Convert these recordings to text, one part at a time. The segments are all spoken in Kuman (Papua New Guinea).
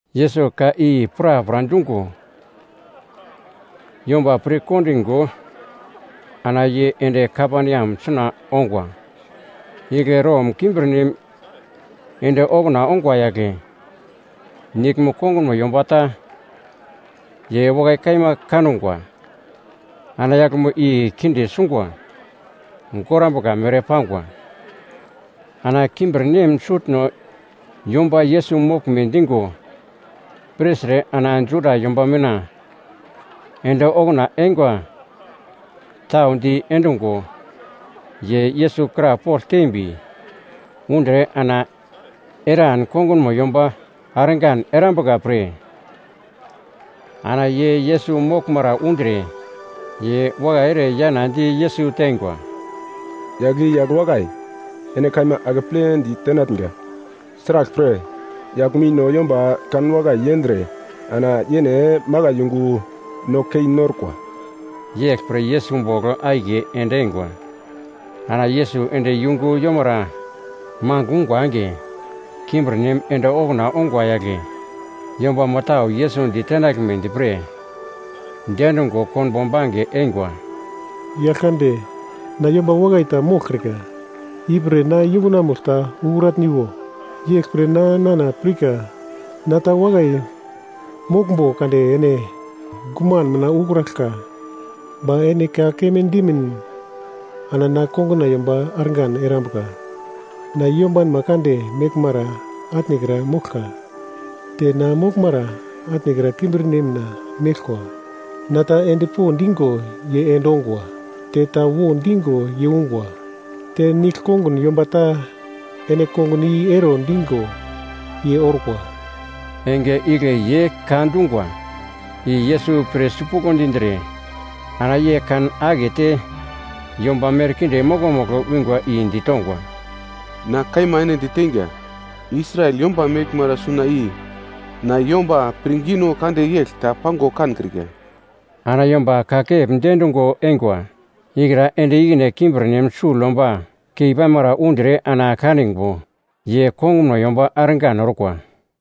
Yesus ka i prapra dungo, yomba pirkondingo ana ye ende Kaperneam suna ongwa. Igle Rom kimbirnem ende okuna ongwa yagle, niglmo kongunmo yomba ta, ye wakai kaima kangwa. Ana yaglmo i kinde sungwa gorambuka mere pangwa. Ana kimbirnem sutno yomba Yesus moglme digo pirtre ana Juda yomba mina ende okuna eingwa tau di endungo ye Yesus krapogl tembi undre ana eran kongunmo yomba argan erambuka pre. Ana ye Yesus moglmara undre, ye wakai ere yana di Yesus teingwa, “Yagl i yagl wakai, ene kaima akepledi tenatnga. Sraglpre yaglmo i no yomba kanwakai yendre ana yene makai yungu no kei norkwa.” Yeglpre Yesus ye bogl akiye ende eingwa. Ana Yesus ende yungu yomara mangigl ungwa enge, kimbirnem ende okuna ongwa yagle yombamo tau Yesus ditenaglmedi pre diendungo konbo bange eingwa. “Yaglkande, na yomba wakai ta moglkrika, ipre na yungunamugl ta ukratniwo. Yeglpre na nana pirka na ta wakai moglmbo kade ene guman mina ukraglka! Ba ene ka keme dimin ana na konguna yomba argan erambuka. Na yombanma kande meglmara atnekra moglka. Te na moglmara atnekra kimbirna nem meglkwa. Na ta endpo digo ye endongwa. Te ta wo digo ye ungwa, te nigl konguna yomba ta ene kongun i ero digo, ye orkwa.” Enge igle ye ka dungwa i Yesus pir sipuglo dindre ana ye kan akete yomba merkinde mokomugl wingwa i ditongwa, “Na kaima ene diteinga, Israel yomba meglmara suna i na yomba pirngino kande yegl ta pango kankrika.” Ana yomba kakep diendungo eingwa ikra ende ikine kimbirnem sugl yomba keipamara undre ana kaningo, ye kongunmo yomba argan orkwa.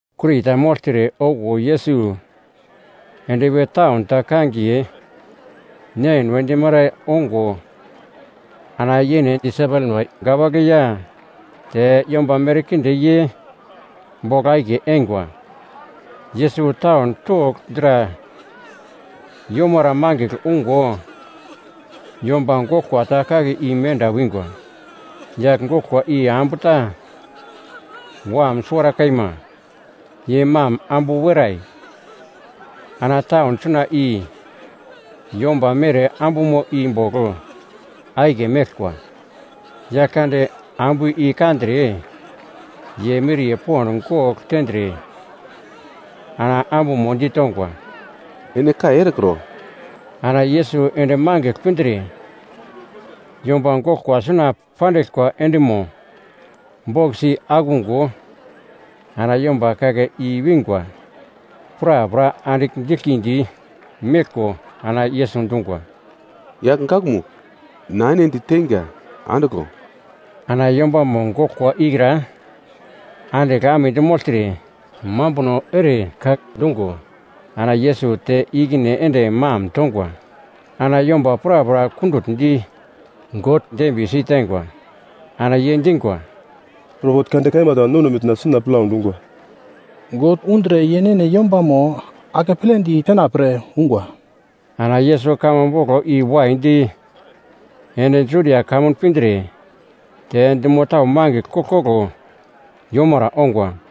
Kuri ta mogltre okuwo Yesus endpi taun ta kangiye Nein we dimara ongo ana yene disaipelma wagle ya te yomba merkinde ye bogl akiye eingwa. Yesus taun togl dra yomara mangigl ungo, yomba goglkwa ta kake i menda wingwa. Yagl goglkwa i ambu ta wam suwara kaima, ye mam ambu werai. Ana taun suna i yomba mere ambumo i bogl akiye meglkwa. Yaglkande ambu i kandre ye miriye pond gogl tendre ana ambumo ditongwa, “Ene kai erekro.” Ana Yesus ende mangigl pindre, yomba goglkwa suna pandiglkwa endimo bokis i akungo ana yomba kake i wingwa prapra andigl diglkindi meglko ana Yesus dungwa, “Yagl gakmugl, na ene diteinga, andiglo.” Ana yombamo goglkwa ikra andigl amedi mogltre, mambuno ere ka dungo ana Yesus te ikine ende mam tongwa. Ana yomba prapra kundutndi, God dembiye siteingwa. Ana ye dingwa, “Propet kande kaima ta nono mina suna plau dungwa. God undre yene yombamo akepledi tenapre ungwa.” Ana Yesus kamo boglo i waidi ende Judia kamun pindre te dumo tau mangigl koglkoglo yomara ongwa.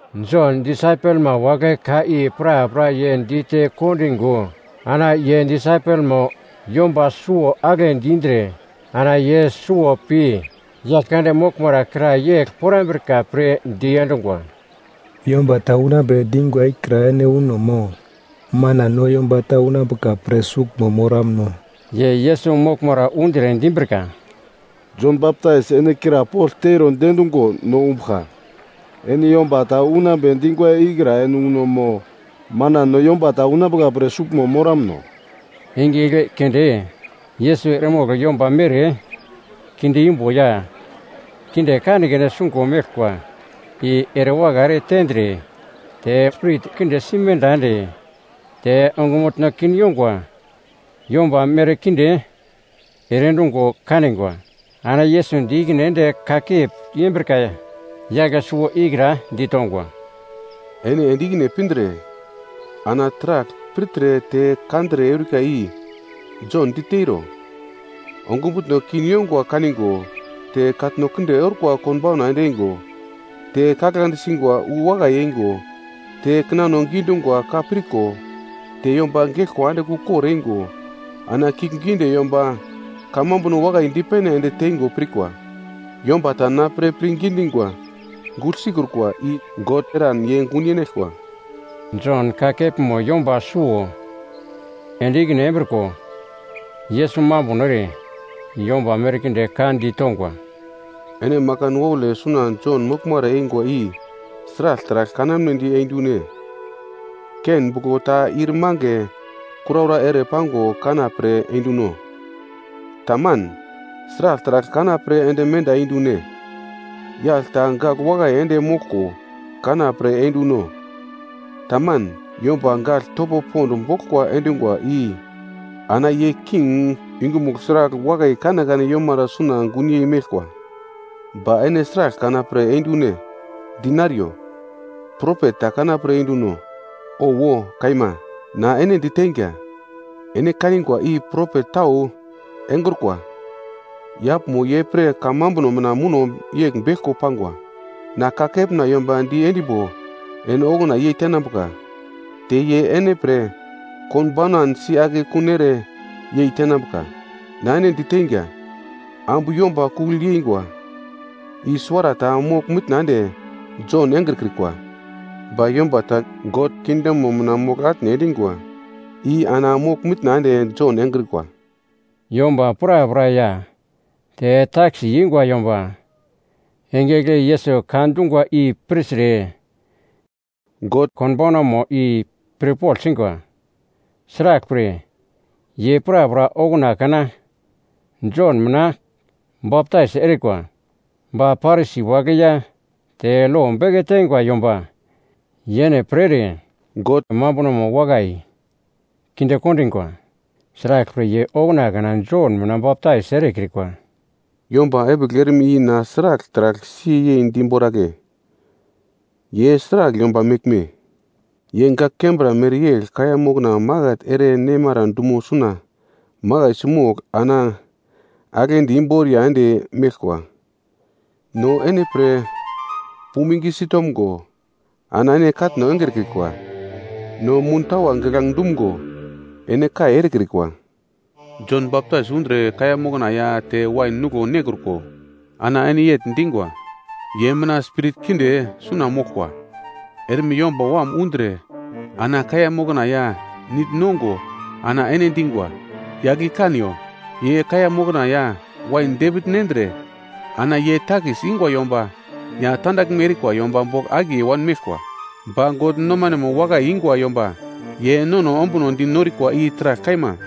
Jon disaipelma wagle ka i prapra ye dite kondingo, ana ye disaipelmo yomba suwo agle dindre. Ana ye suwo pi Yaglkande moglmara kra yegl porambrika pre diendungwa, “Yomba ta unambe dingwa ikra ene uno mo manan no yomba ta unambuka pre suglmo moramno?” Ye Yesus moglmara undre dimbrika, “Jon Baptais ene krapogl teiro diendungo no umbuglka, ‘Ene yomba ta unambe dingwa ikra ene uno mo manan no yomba ta unambuka pre sugl moramno?’” Enge igle keunde Yesus eremogl yomba mere kinde imbo ya kinde kanekane sungo meglkwa i erewakai ere tendre te spirit kinde simenda ende te ongumutno kin yongwa yomba merkinde ere endungo kanigwa. Ana Yesus di ikine ende kakep yembrika yagl suwo ikra ditongwa, “Ene ende ikine pindre ana taragl pirtre te kandre eurika i Jon diteiro. Ongumutno kin yongwa kaningo te katno kinde orkwa konbauna ende eingo, te kaglande singwa wu wakai eingo te kinano gidungwa ka pirko te yomba geglkwa andigl ukor eingo ana kiuglgiunde yomba kamambuno wakai dipene ende teingo pirkwa. Yomba ta na pre pirngi dingwa gugl sikrukwa i God eran ye gun yenaglkwa.” Jon ka kepmo yomba suwo ende ikine embriko, Yesus mambuno ere, yomba merkinde ka ditongwa, “Ene makan waule suna Jon moglmara eingwa i sragl taragl kanamnedi eindune? Ken buglo ta ir mange kuraura ere pango kana pre einduno? Tamanan, sragl taragl kana pre ende menda eindune? Yagl ta gagl wakai ende moglko kana pre einduno? Taman, yomba gagl topo pond boglkwa endungwa i ana ye king yungumugl sragl wakai kanekane yomara suna gunyei meglkwa. Ba ene sragl kana pre endune, dinariyo? Propet ta kanapre enduno? Owo kaima, na ene diteinga, ene kanigwa i propet tau engrukwa. Yaglmo ye pre kamambuno mina muno yegl beglko pangwa, “‘Na kakepna yomba di endimbo ene okuna yei tenambuka, te ye ene pre konbaunan si akekun ere yei tenambuka.’ Na ene diteinga, ambu yomba kugl yeingwa i suwarata mogl-mitna ende Jon engrekrikwa. Ba yomba ta God kingdomo mina mogl-atne endingwa i ana mogl-mitna ende Jon engrikwa.” Yomba prapra ya te takis ingwa yomba, enge igle Yesus ka dungwa i pirtre God konbaunamo i pirpogl singwa. Sraglpre ye prapra okuna kana Jon mina baptais erikwa. Ba Parisi wagle ya te lo beke teingwa yomba yene pre ere God mambunomo wakai kinde kondingwa. Sraglpre ye okuna kana Jon mina baptais erekrikwa. “Yomba epigl erme i na sragl taragl siye yei diboragle? Ye sragl yomba meglme? Ye gak kembra mereyegl kaiya mokna maket ere nemara dumo suna makaisi mogl ana aglendi imboriya ende meglkwa: “‘No ene pre puming sitomgo, ana ene katno engrekrikwa. No muntawa giglange dumgo, ene kai erekrikwa.’ Jon Baptais undre kaiya mokna ya te wain nuglo nekruko, ana ene yegl dingwa, ‘Ye mina spirit kinde suna moglkwa.’ Erme Yomba Wam undre ana kaiya mokna ya nigl nongo ana ene dingwa, ‘Yagl i kaniyo! Ye kaiya mokna ya wain depigl nendre ana ye takis ingwa yomba ya tandaglme erikwa yomba bogl akiye wanmeglkwa.’ Ba God nomanemo wakai ingwa yomba ye nono ombuno di norikwa i taragl kaima.”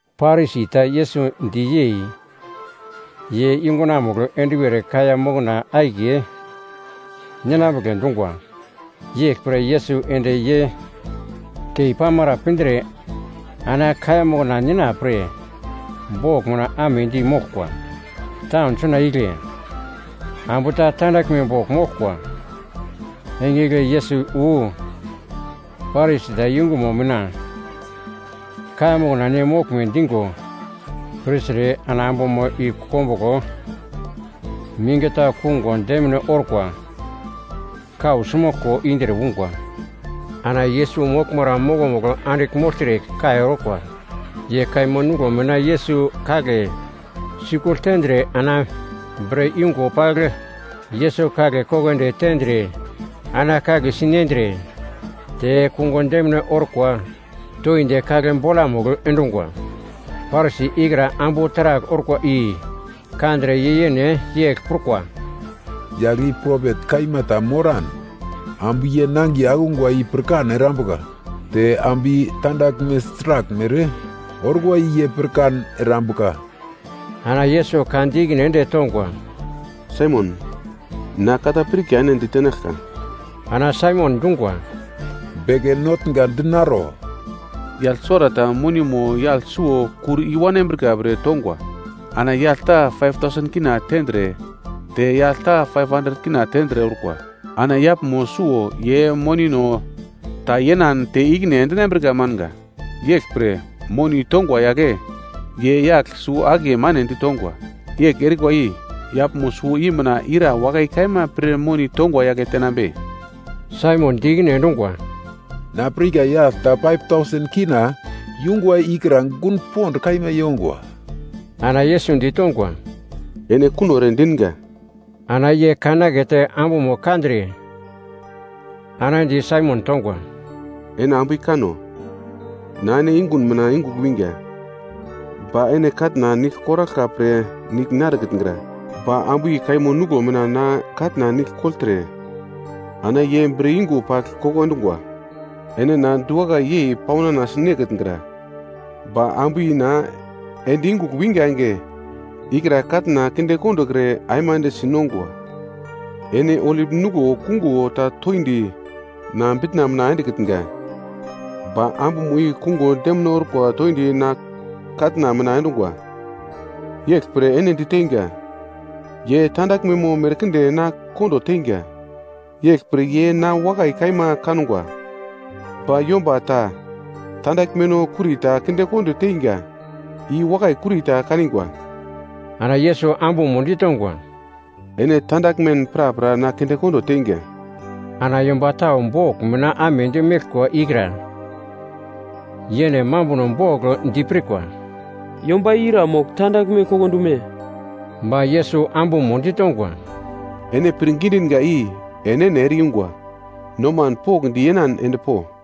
Parisi ta Yesus di yei, ye yungunamugl enduwer kaiya mokna akiye ninambugle dungwa. Yeglpre Yesus ende ye keipamara pindre ana kaiya mokna nina pre bogl mina amedi moglkwa. Taun suna igle ambu ta tandaglme bogl moglkwa. Enge igle Yesus wu Parisi ta yungumo mina kaiya mokna ne moglme digo pirtre ana ambumo i kombuglo mingi ta kungo demine orkwa kausi moglko indre ungwa. Ana Yesus moglmara mokomugl andigl mogltre kai orkwa. Ye kaimo nuglo mina Yesus kagle sikugl tendre ana bre yungo pagl Yesus kagle koko ende tendre ana kagle si nendre, te kungo demine orkwa toindi kagle bolamugl endungwa. Parisi ikra ambu taragl orkwa i kandre ye yene yegl prukwa, “Yagl i propet kaima ta moran, ambu ye nangiye akungwa i pirkan erambuka te ambu i tandaglme sraglmere orkwa i ye pirkan erambuka.” Ana Yesus ka di ikine ende tongwa, “Saimon, na ka ta pirka ene ditenaglka.” Ana Saimon dungwa, “Beke Notnga dinaro.” “Yagl suwarata monimo yagl suwo kur i wanambrika pre tongwa. Ana yagl ta K5,000 tendre te yagl ta K500 tendre orkwa. Ana yaglmo suwo ye monino ta yenan te ikine endinambrika manga. Yeglpre, moni tongwa yagle ye yagl suwo-akiye mane ditongwa. Yegl erikwa i yaglmo suwo i mina ira wakai kaima pir moni tongwa yagle tenambe?” Saimon di ikine endungwa, “Na pirka yagl ta K5,000 yungwa ikra gun pond kaima yongwa.” Ana Yesus ditongwa, “Ene kuno ere dinga.” Ana ye kan akete ambumo kandre ana di Saimon tongwa, “Ene ambu i kano? Na ene yungun mina yungugl winga, ba ene katna nigl koraglka pre nigl narekitngra. Ba ambu i kaimo nuglo mina na katna nigl kogltre ana ye bre yungo pagl koko endungwa. Ene na diwakai yei paunana sinekitngra. Ba ambu i na ende yungugl winga enge ikra katna kinde kondokre aimande sinongwa. Ene olip nuglo kungo ta toindi na bitna mina endekitnga. Ba ambumo i kungo demine orkwa toindi na katna mina endungwa. Yeglpre ene diteinga, ye tandaglmemo merkinde na kondo teingwa. Yeglpre ye na wakai kaima kangwa. Ba yomba ta tandaglmeno kurita kindekondo teingwa, i wakai kurita kanigwa.” Ana Yesus ambumo ditongwa, “Ene tandaglmen prapra na kindekondo teinga.” Ana yomba tau bogl mina amedi meglkwa ikra yene mambuno bogl dipirkwa, “Yomba i ira mogl tandaglme koko endume?” Ba Yesus ambumo ditongwa, “Ene pirngi dinga i enene ere-yungwa, noman pokndi yenan endpo.”